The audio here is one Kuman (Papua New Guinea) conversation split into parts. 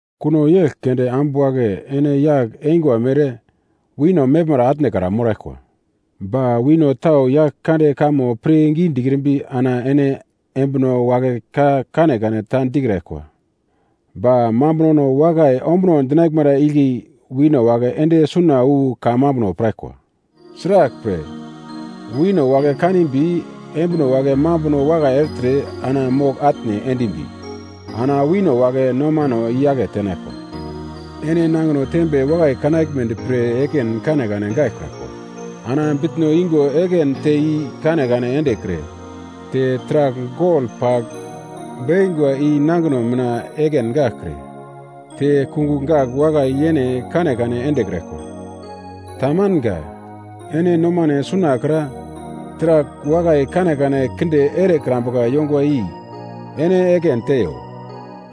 Kuno yegl keunde ambu wagle ene yagl eingwa mere wino meglmara atnekra moraglkwa. Ba wino tau Yaglkande kamo pirngi dikrimbi, ana ene embino wagle ka kanekane ta dikraglkwa ba mambunono wakai ombuno dinaglmara igle wino wagle ende suna wu kamambuno piraglkwa. Sraglpre, wino wagle kanimbi embino wagle mambuno wakai ertre ana mogl-atne endimbi ana wino wagle nomano i-yake tenaglkwa. Ene nangino tembe wakai kanaglmedi pre ekin kanekane gaglkraglkwa. Ana bitno yungo ekin te i-kanekane endekre te taragl gol pagl bekingwa i nangino mina ekin gaglkre te kungugl gagl wakai yene kanekane endekraglkwa. Tamanga. Ene nomano sunakra, taragl wakai kanekane kinde erekrambuka yongwa i ene ekin teiyo.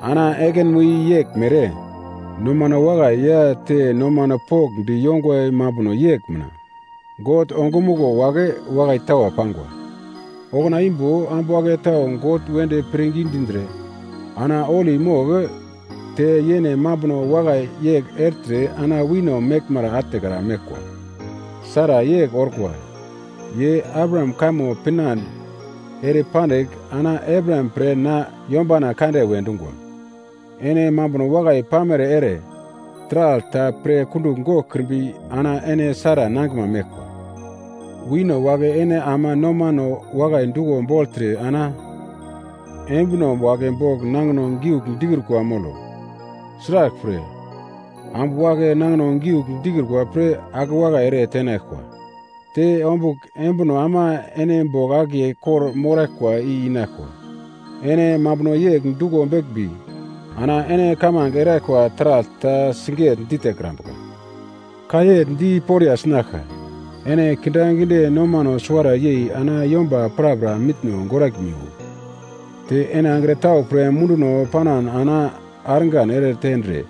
Ana ekinmo i yeglmere, nomano wakai ya te nomano pokndi yongwa mambuno yegl mina God ongumuglo wagle wakai tawa pangwa. Okuna imbo ambu wagle tau God wedi pirngi dindre, ana holi mogl te yene mambuno wakai yegl ertre ana wino meglmara atnekra meglkwa. Sara yegl orkwa, ye Abraham kamo pinande ere pandigl, ana Abraham pre na yombana kande we dungwa. Ene mambuno wakai pamere ere taragl ta pre kundugl goglkrimbi ana ene Sara nangiglma meglkwa. Wino wagle ene ama nomano wakai duglo bogltre ana embino wagle bogl nangino giugl dikrukwa molo. Sraglpre, ambu wagle nangino giugl dikrukwa pre akewakai ere tenaglkwa. Te ombugl embino ama ene bogl akiye kor-moraglkwa i inaglkwa. Ene mambuno yegl duglo beglmbi ana ene kamange eraglkwa taragl ta siget-ditekrambuka. Ka yegl di poriya sinaglka. Ene kindaginde nomano suwara yei ana yomba prapra mitno goraglmiwo. Te ene angro tau pre munduno panan ana argan ere tendre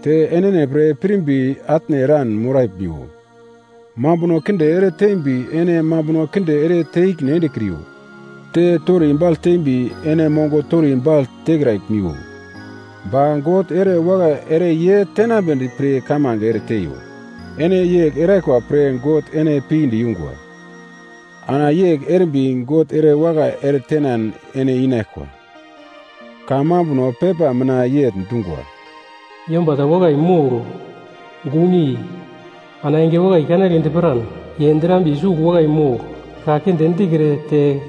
te enene pre pirimbi atne eran moraglmiwo. Mambuno kinde ere tembi ene mambuno kinde ere te ikine endekriyo. Te tori baglte tembi, ene mongo tori bagl tekraglmiwo. Ba God ere wakai ere ye tenambedi pre kamange ere teiyo. Ene yegl eraglkwa pre God ene pinde yungwa, ana yegl erimbi God ere wakai ere tenan ene inaglkwa. Kamambuno pepa mina yegl dungwa, “Yomba ta wakai mogl, gunyei ana enge wakai kanagledi piran, ye drambiye sugl wakai mogl, ka kinde dikre te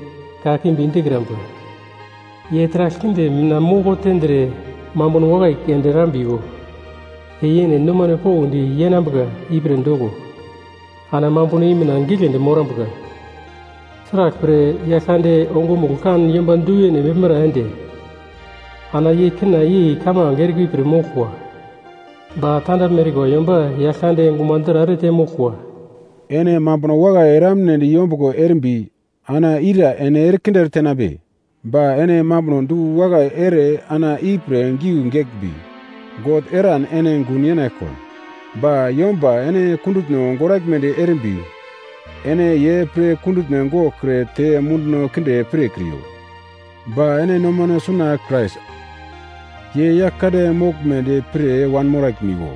kakimbi dikrambuka. Ye taragl kinde mina moko tendre, mambuno wakai keunde erambiwo, ye yene nomane pokndi yenambuka ipre doko, ana mambuno i mina giglendi morambuka. Sraglpre Yaglkande ongumuglo kan yomba, duyene meglmara ende, ana ye kina yei kamange erikwa i pir moglkwa, ba tandaglme erikwa yomba. Yaglkande gumadra ere temoglkwa.” Ene mambuno wakai eramnedi yombuglo erimbi ana ira ene erekinde eretenambe? Ba ene mambuno du-wakai ere ana ipre giugl geglmbi, God eran ene gun yenaglkwa. Ba yomba ene kundutno goraglmedi erimbi ene ye pre kundutno goglkre te munduno kinde pirkriyo. Ba ene nomano suna Krais ye Yaglkande moglmedi pir wanmoraglimiwo.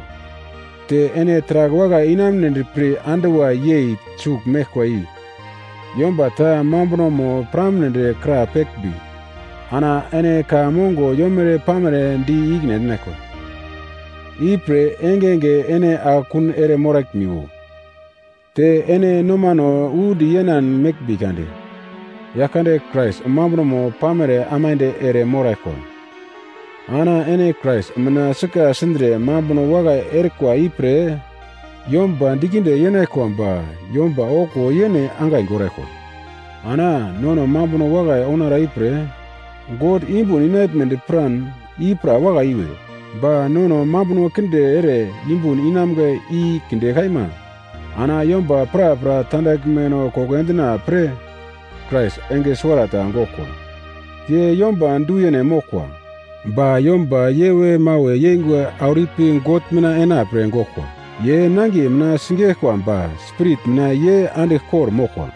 Te ene taragl wakai inamunedi pre anduwa yei sugl meglkwa i yomba ta mambunomo piramnedi krapeglmbi ana ene ka mongo yomere-pamere di ikine endinaglkwa, ipre engenge ene akekun ere moraglmiwo. Te ene nomano undi yenan meglmbi kade Yaglkande Krais mambunomo pamere aimande ere moraglkwa. Ana ene Krais mina sika sindre mambuno wakai erikwa ipre yomba dikinde yenaglkwa ba yomba okuwo yene angai goraglkwa. Ana nono mambuno wakai ounara ipre God yumbun inaglmedi piran, i pra wakai iwe. Ba nono mambuno kinde ere yumbun inamga i kinde kaima. Ana yomba prapra tandaglmeno koko endina pre Krais enge suwarata goglkwa. Ye yomba du-yene moglkwa, ba yomba yewe-mawe yeingwa auro ipi God mina ena pre goglkwa. Ye nangiye mina sigeglkwa ba Spirit mina ye andigl kor-moglkwa.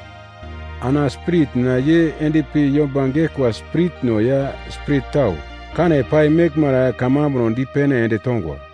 Ana Spirit mina ye endpi yomba geglkwa spiritno ya spirit tau kane pai meglmara kamambuno dipene ende tongwa,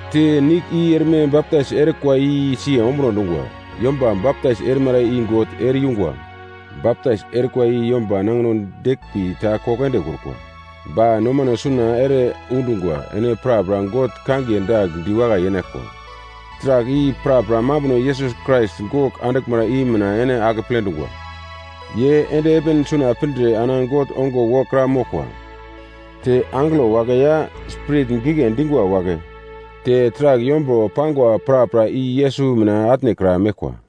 Te nigl i erme baptais erikwa i siye ombuno dungwa. Yomba baptais erimara i God ere-yungwa. Baptais erikwa i yomba nangino deglmbi ta koko endekrukwa, ba nomano suna ere undungwa ene prapra God kangiye dagl diwakai yenaglkwa, taragl i, prapra mambuno Yesus Krais gogl anduglmara i mina ene akeple dungwa. Ye ende heven suna pindre ana God ongo wokra moglkwa. Te angelo wagle ya, spirit gigle dingwa wagle te taragl yombro pangwa prapra i Yesus mina atnekra meglkwa.